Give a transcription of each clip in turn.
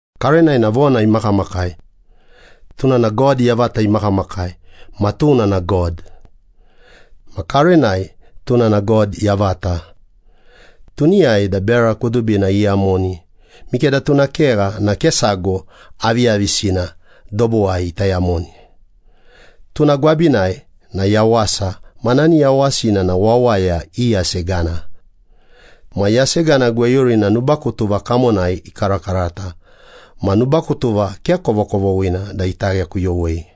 Karenai na Vona imakamakai. Tuna na God yavata imakamakai, ma tuna na God. Ma karenai tuna na God yavata. Tuniyai da bera kudubina iyamoni, mikeda tuna kegha na ke sago aviyavisina dobuwai ita yamoni. Tuna gwabinai na yawasa, ma nani yawasina na wawaya i yasegana. Ma yasegana gweyurina nubakutuva kamonai ekarakarata ma nubakutuva ke kovokovoghina da ita ghekuyowei.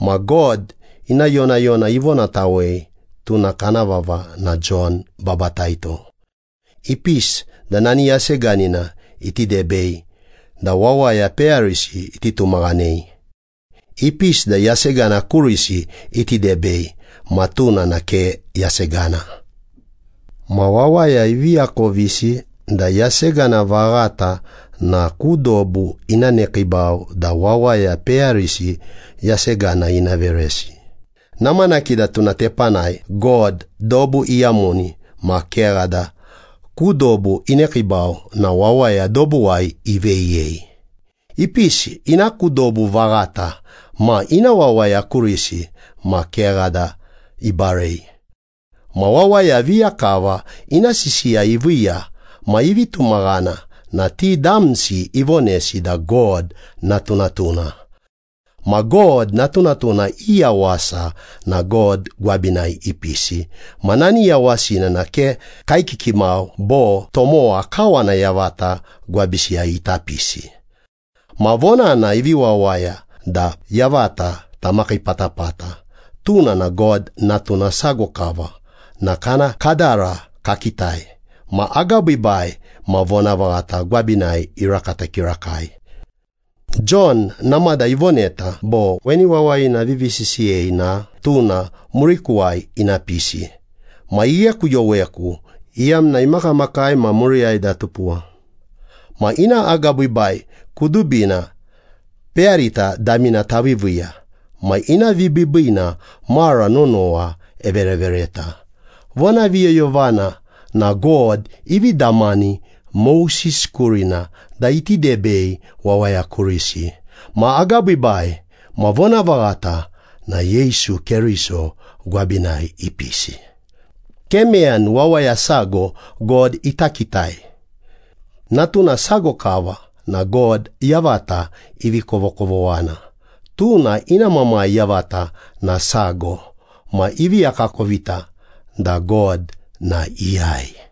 Ma God ina yonayona ivonatawei, tuna kana vava na Jon Babataito. Ipisi da nani yaseganina iti debei da wawaya peyarisi iti tumaghanei. Ipisi da yasegana kurisi iti debei, ma tuna na ke yasegana. Ma wawaya ivi akovisi da yasegana vaghata na ku dobu ina nekiibau da wawaya peyarisi yasegana ina veresi. Namanaki da tuna tepanai God dobu iyamoni ma kegha da ku dobu inekiibau na wawaya dobuwai iveyiyei. Ipisi ina ku dobu vaghata ma ina wawaya kurisi ma kegha da ibarei. Ma wawaya viya kava ina sisiya iviiya ma ivi tumaghana na ti damsi ivonesi da God natunatuna. Ma God natunatuna i yawasa na God gwabinai ipisi. Ma nani yawasina na ke kaekiki mau bo tomowa kawana yavata gwabisiyai ita pisi. Ma Vonana ivi wawaya da yavata tamakii patapata. Tuna na God Natuna sago kava na kana kadara kakitai. Ma agabiibai ma vonavaghata gwabinai irakata kirakai. Jon namada ivoneta bo, “Weni wawayina avivi sisiyei na, ‘Tuna murikuwai ina pisi. Ma ighekuyoweku, iyamna imakamakai ma muriyai da atupuwa.’” Ma ina agabiibai kudubina peyarita damina taviiviiya ma ina vibiibiina mara nonowa everevereta. Vonaviyoyovana na God ivi damani Moses kurina da iti debei wawaya kurisi. Ma agabiibai ma vonavaghata na Yesu Keriso gwabinai ipisi. Ke meyani wawaya sago God ita kitai. Natuna sago kava na God yavata ivi kovokovoghana. Tuna ina Mamai yavata na sago. Ma ivi akakovita da God na iyai.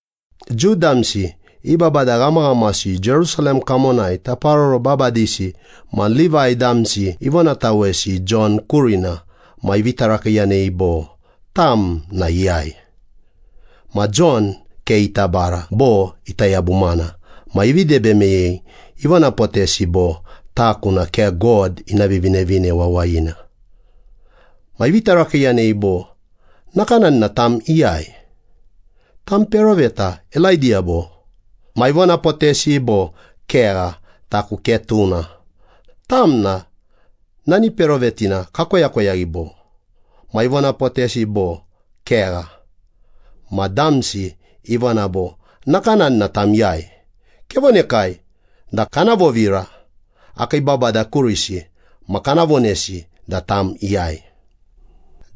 Jiu damsi i babada ghamaghamasi Jerusalem kamonai taparoro babadisi ma Livai damsi ivonatawesi Jon kurina ma ivi tarakiiyanei bo, “Tam na iyai?” Ma Jon ke ita bara bo ita yabumana ma ivi debe meyei, ivonapotesi bo, “Taku na ke God ina Vivinevine Wawayina.” Ma ivi tarakiiyanei bo, “Nakanani na tam iyai? Tam peroveta Elaidiya bo?” Ma ivonapotesi bo, “Kegha, taku ke tuna.” “Tam na nani perovetina kakoyakoyaghi bo?” Ma ivonapotesi bo, “Kegha.” Ma damsi ivona bo, “Nakanani na tam iyai? Kevonekai da kana vovira akii babada kurisi ma kana vonesi da tam iyai.”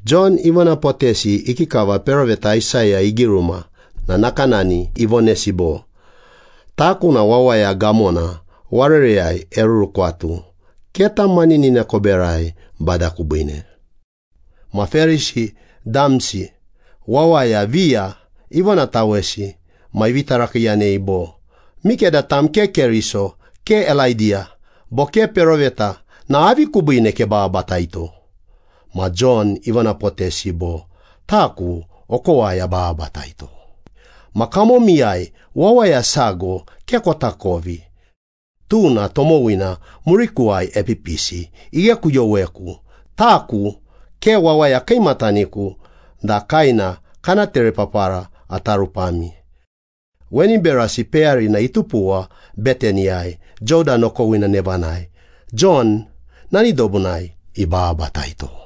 Jon ivonapotesi ikikava peroveta Aisaya igiruma na nakanani ivonesi bo, “Taku na wawaya gamona warereyai erurukwatu, ‘Keta maninina koberai, Bada kubiine.’” Ma Perisi damsi wawaya viya ivonatawesi ma ivi tarakiiyanei bo, “Mikeda tam ke Keriso, ke Elaidiya bo ke peroveta na avi kubiine kebababataito?” Ma Jon ivonapotesi bo, “Taku okowai abababataito. Ma kamomiyai wawaya sago ke kotakovi. Tuna tomowina murikuwai epipisi. Ighekuyoweku, taku ke wawaya kiimataniku da kaena kana terepapara ata rupami.” Weni berasi peyarina itupuwa Betaniyai, Jodan okowina nevanai, Jon nani dobunai ibababataito.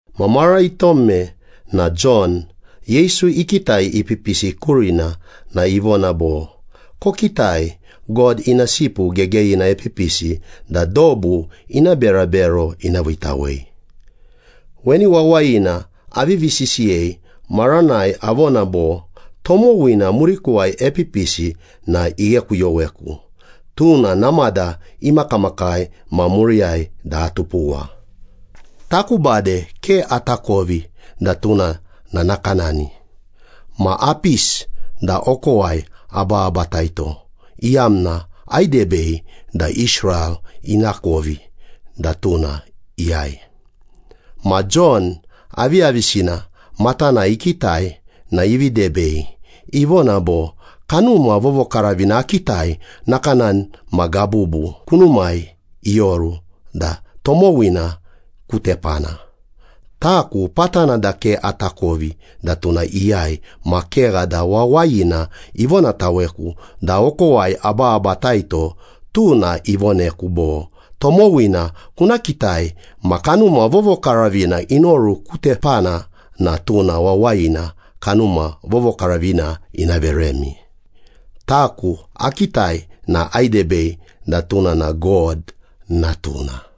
Ma mara itome na Jon, Yesu ikitai ipipisi kurina na ivona bo, “Kokitai, God Ina Sipu Gegeyina epipisi da dobu ina berabero ina viitawei. Weni wawayina avivi sisiyei maranai avona bo, ‘Tomowina murikuwai epipisi na ighekuyoweku, tuna namada imakamakai ma muriyai da atupuwa.’ Taku bade ke atakovi da tuna na nakanani, ma apisi da okowai abababataito, iyamna aidebei da Israel inakovi da tuna iyai.” Ma Jon aviyavisina matanai ikitai na ivi debei, ivona bo “Kanuma Vovokaravina akitai nakanani ma gabubu kunumai ioru da tomowina ku tepana. Taku patana da ke atakovi da tuna iyai ma kegha da Wawayina ivonataweku da okowai abababataito tuna ivoneku bo, ‘Tomowina kuna kitai ma Kanuma Vovokaravina inoru ku tepana na tuna wawayina Kanuma Vovokaravina ina veremi.’ Taku akitai na aidebei da tuna na God Natuna.”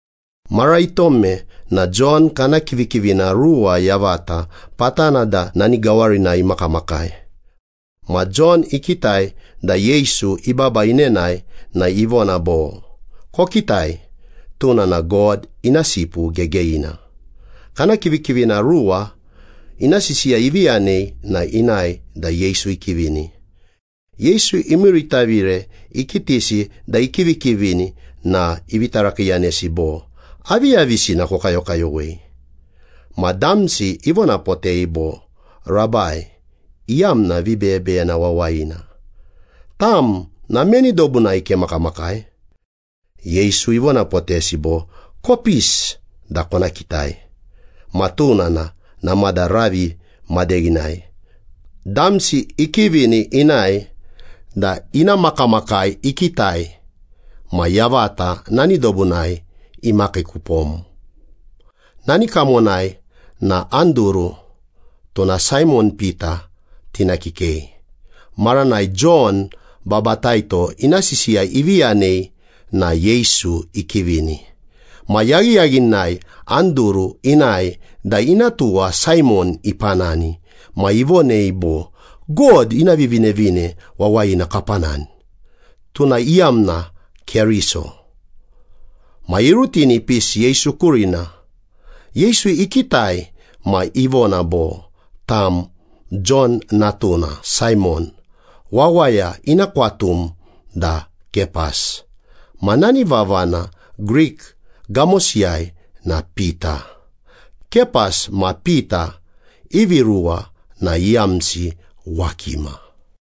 Mara itome ma Jon kana kivikivina ruwa yavata patana da nani gawarinai imakamakai. Ma Jon ikitai da Yesu ibaba inenae na ivona bo, “Kokitai, tuna na God ina Sipu Gegeyina.” Kana kivikivina ruwa ina sisiya ivi yanei na inae da Yesu ikivini. Yesu imiiritavire ikitisi da ikivikivini na ivi tarakiiyanesi bo, “Aviyavisina kokayokayowei?” Ma damsi ivonapotei bo, “Rabai (iyamna vibeyebeyena wawayina), tam na meni dobunai kemakamakai?” Yesu ivonapotesi bo, “Kopisi da kona kitai.” Ma tuna na namada ravi madeghinai. Damsi ikivini inae da ina makamakai ikitai, ma yavata nani dobunai imakii kupom. Nani kamonai na Anduru, (tuna Saimon Pita tina kikei.) Maranai Jon Babataito ina sisiya ivi yanei na Yesu ikivini. Ma yaghiyaghinai Anduru inae da ina tuwa Saimon ipanani ma ivonei bo, “God ina Vivinevine Wawayina kapanani.” (Tuna iyamna Keriso.) Ma irutini ipisi Yesu kurina. Yesu ikitai ma ivona bo, “Tam Jon natuna Saimon, wawaya ina kwatum da Kepas.” Ma nani vavana Grik gamosiyai na Pita. (Kepas ma Pita ivi ruwa na iyamsi ‘wakima.’)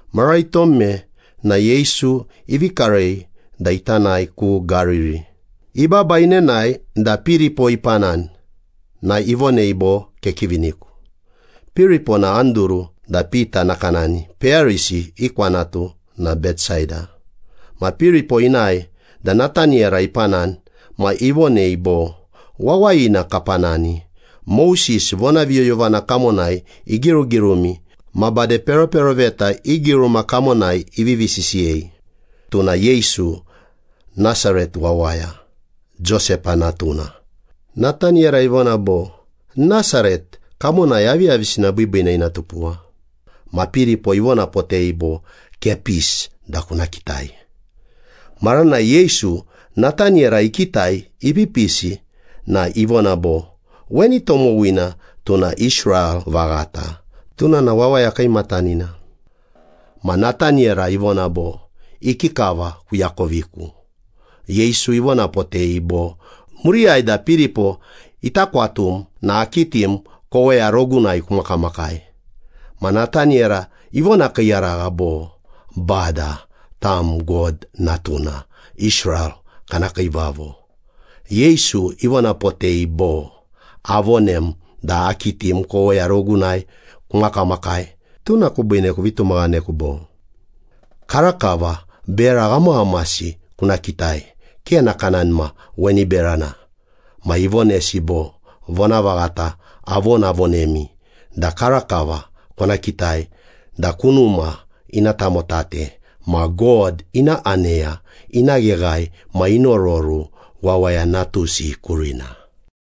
Mara itome na Yesu ivi karei da ita nae ku Gariri. Ibaba inenae da Piripo ipanani na ivonei bo, “Kekiviniku.” Piripo na Anduru da Pita nakanani, peyarisi i kwanatu na Betsaida. Ma Piripo inae da Nataniyera ipanani ma ivonei bo, “Wawayina kapanani. Moses vonaviyoyovana kamonai igirugirumi ma bade peroperoveta i giruma kamonai ivivi sisiyei. Tuna Yesu, Nasaret wawaya, Josepa natuna.” Nataniyera ivona bo, “Nasaret. Kamonai aviyavisina biibiina ina tupuwa?” Ma Piripo ivonapotei bo, “Kepisi da kuna kitai.” Maranai Yesu Nataniyera ikitai ipipisi na ivona bo, “Weni tomowina tuna Israel vaghata. Tuna na wawaya kiimatanina.” Ma Nataniyera ivona bo, “Ikikava kuakoviku?” Yesu ivonapotei bo, “Muriyai da Piripo ita kwatum na akitim koweya rogunai kumakamakai.” Ma Nataniyera ivonakiiyaragha bo, “Bada, tam God Natuna, Israel kana Kiivavo.” Yesu ivonapotei bo, “Avonem da akitim koweya rogunai kumakamakai, tuna kubiine kuvi tumaghaneku, bo? Karakava bera ghamaghamasi kuna kitai ke nakanani ma weni berana.” Ma ivonesi bo, “Vonavaghata avonavonemi da karakava kona kitai da kunuma ina tamotate ma God ina aneya ina gheghae ma inororu Wawaya Natusi kurina.”